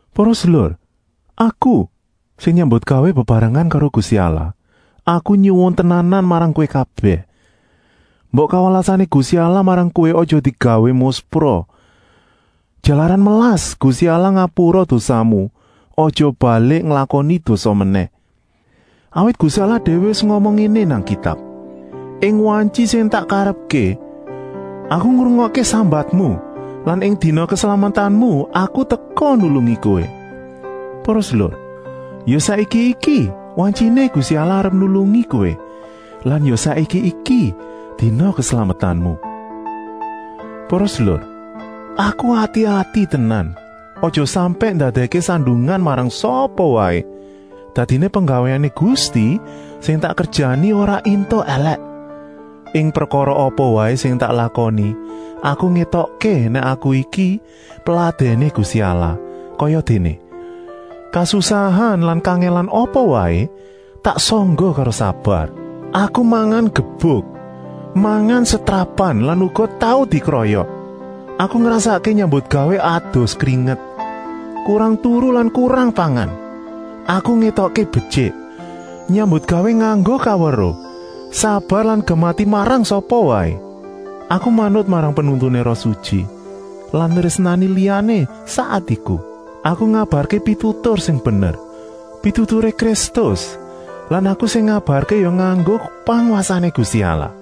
Para sedulur, aku, sing nyambutgawé bebarengan karo Gusti Allah, aku nyuwun tenanan marang kowé kabèh: mbok kawelasané Gusti Allah marang kowé aja digawé muspra. Jalaran melas, Gusti Allah ngapura dosamu, aja balik nglakoni dosa menèh. Awit Gusti Allah déwé wis ngomong ngéné nang Kitab: “Ing wantyi sing tak karepké Aku ngrungokké sambatmu lan ing dina keslametanmu Aku teka nulungi kowé.” Para sedulur, ya saiki iki wantyiné Gusti Allah arep nulungi kowé lan ya saiki iki dina keslametanmu. Para sedulur, aku ngati-ati tenan aja sampèk ndadèkké sandungan marang sapa waé. Dadiné penggawéané Gusti sing tak kerjani ora éntuk èlèk. Ing prekara apa waé sing tak lakoni aku ngétokké nèk aku iki peladèné Gusti Allah, kayadéné: kasusahan lan kangèlan apa waé tak sangga karo sabar. Aku mangan gebuk, mangan setrapan lan uga tau dikroyok. Aku ngrasakké nyambutgawé adus kringet, kurang turu lan kurang pangan. Aku ngétokké betyik, nyambutgawé nganggo kaweruh, sabar lan gemati marang sapa waé. Aku manut marang pinuntuné Roh Sutyi lan nrésnani liyané sak atiku. Aku ngabarké pitutur sing bener, pituturé Kristus lan aku sing ngabarké ya nganggo pangwasané Gusti Allah.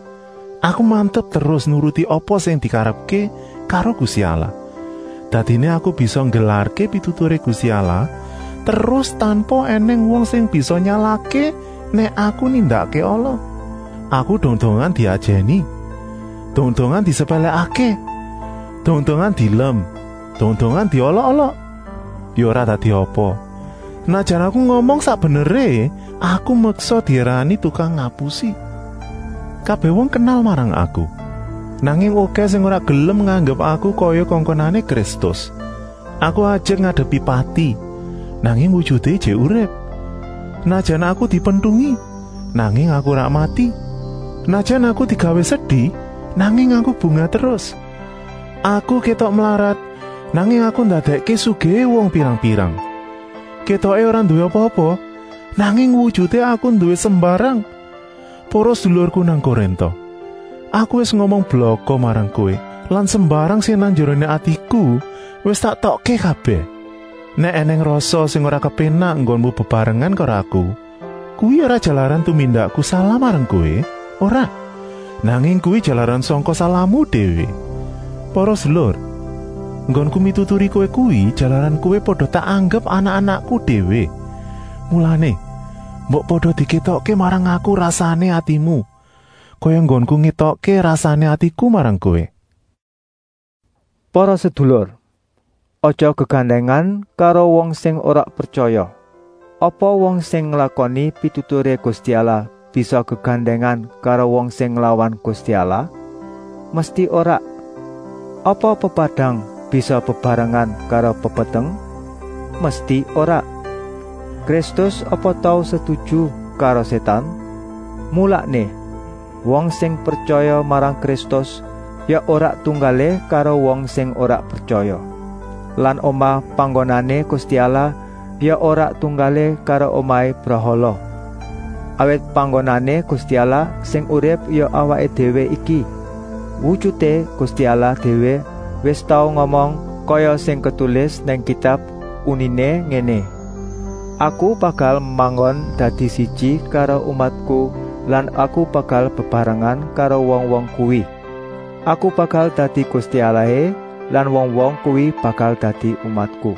Aku mantep terus nuruti apa sing dikarepké karo Gusti Allah, dadiné aku bisa nggelarké pituturé Gusti Allah terus tanpa ènèng wong sing bisa nyalahké nèk aku nindakké ala. Aku dong-dongan diajèni, dong-dongan disepèlèkké, dong-dongan dielem, dong-dongan diolok-olok. Ya ora dadi apa. Senajan aku ngomong sak beneré, aku meksa diarani tukang ngapusi. Kabèh wong kenal marang aku, nanging okèh sing ora gelem nganggep aku kaya kongkonané Kristus. Aku ajek ngadepi pati, nanging wujuté ijik urip. Senajan aku dipentungi, nanging aku ora mati. Senajan aku digawé sedi, nanging aku bungah terus. Aku kétok mlarat, nanging aku ndadèkké sugihé wong pirang-pirang. Kétoké ora nduwé apa-apa, nanging wujuté aku nduwé sembarang. Para sedulurku nang Korinta, aku wis ngomong blaka marang kowé lan sembarang sing nang njeroné atiku wis tak etokké kabèh. Nèk ènèng rasa sing ora kepénak enggonmu bebarengan karo aku, kuwi ora jalaran tumindakku salah marang kowé, ora, nanging kuwi jalaran sangka salahmu déwé. Para sedulur, enggonku mituturi kowé kuwi jalaran kowé pada tak anggep anak-anakku déwé. Mulané, mbok pada dikétokké marang aku rasané atimu, kaya enggonku ngétokké rasané atiku marang kowé. Para sedulur, aja gegandèngan karo wong sing ora pretyaya. Apa wong sing nglakoni pituturé Gusti Allah bisa gegandèngan karo wong sing nglawan Gusti Allah? Mesti ora. Apa pepadang bisa bebarengan karo pepeteng? Mesti ora. Kristus apa tau setuju karo Sétan? Mulané, wong sing pretyaya marang Kristus ya ora tunggalé karo wong sing ora pretyaya. Lan omah panggonané Gusti Allah ya ora tunggalé karo omahé brahala. Awit panggonané Gusti Allah sing urip ya awaké déwé iki. Wujuté Gusti Allah déwé wis tau ngomong, kaya sing ketulis nang Kitab, uniné ngéné: “Aku bakal manggon dadi siji karo umatku lan Aku bakal bebarengan karo wong-wong kuwi. Aku bakal dadi Gusti Allahé lan wong-wong kuwi bakal dadi umatku.”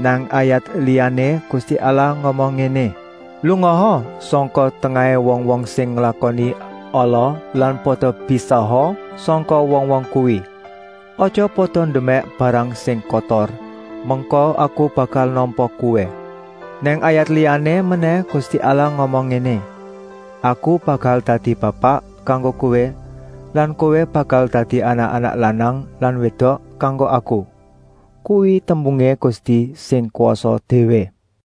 Nang ayat liyané Gusti Allah ngomong ngéné: “Lungaa sangka tengahé wong-wong sing nglakoni ala lan pada pisaha sangka wong-wong kuwi. Aja pada ndemèk barang sing kotor, mengko Aku bakal nampa kowé.” Nang ayat liyané menèh Gusti Allah ngomong ngéné: “Aku bakal dadi bapak kanggo kowé lan kowé bakal dadi anak-anak lanang lan wédok kanggo Aku. Kuwi tembungé Gusti sing kwasa déwé.”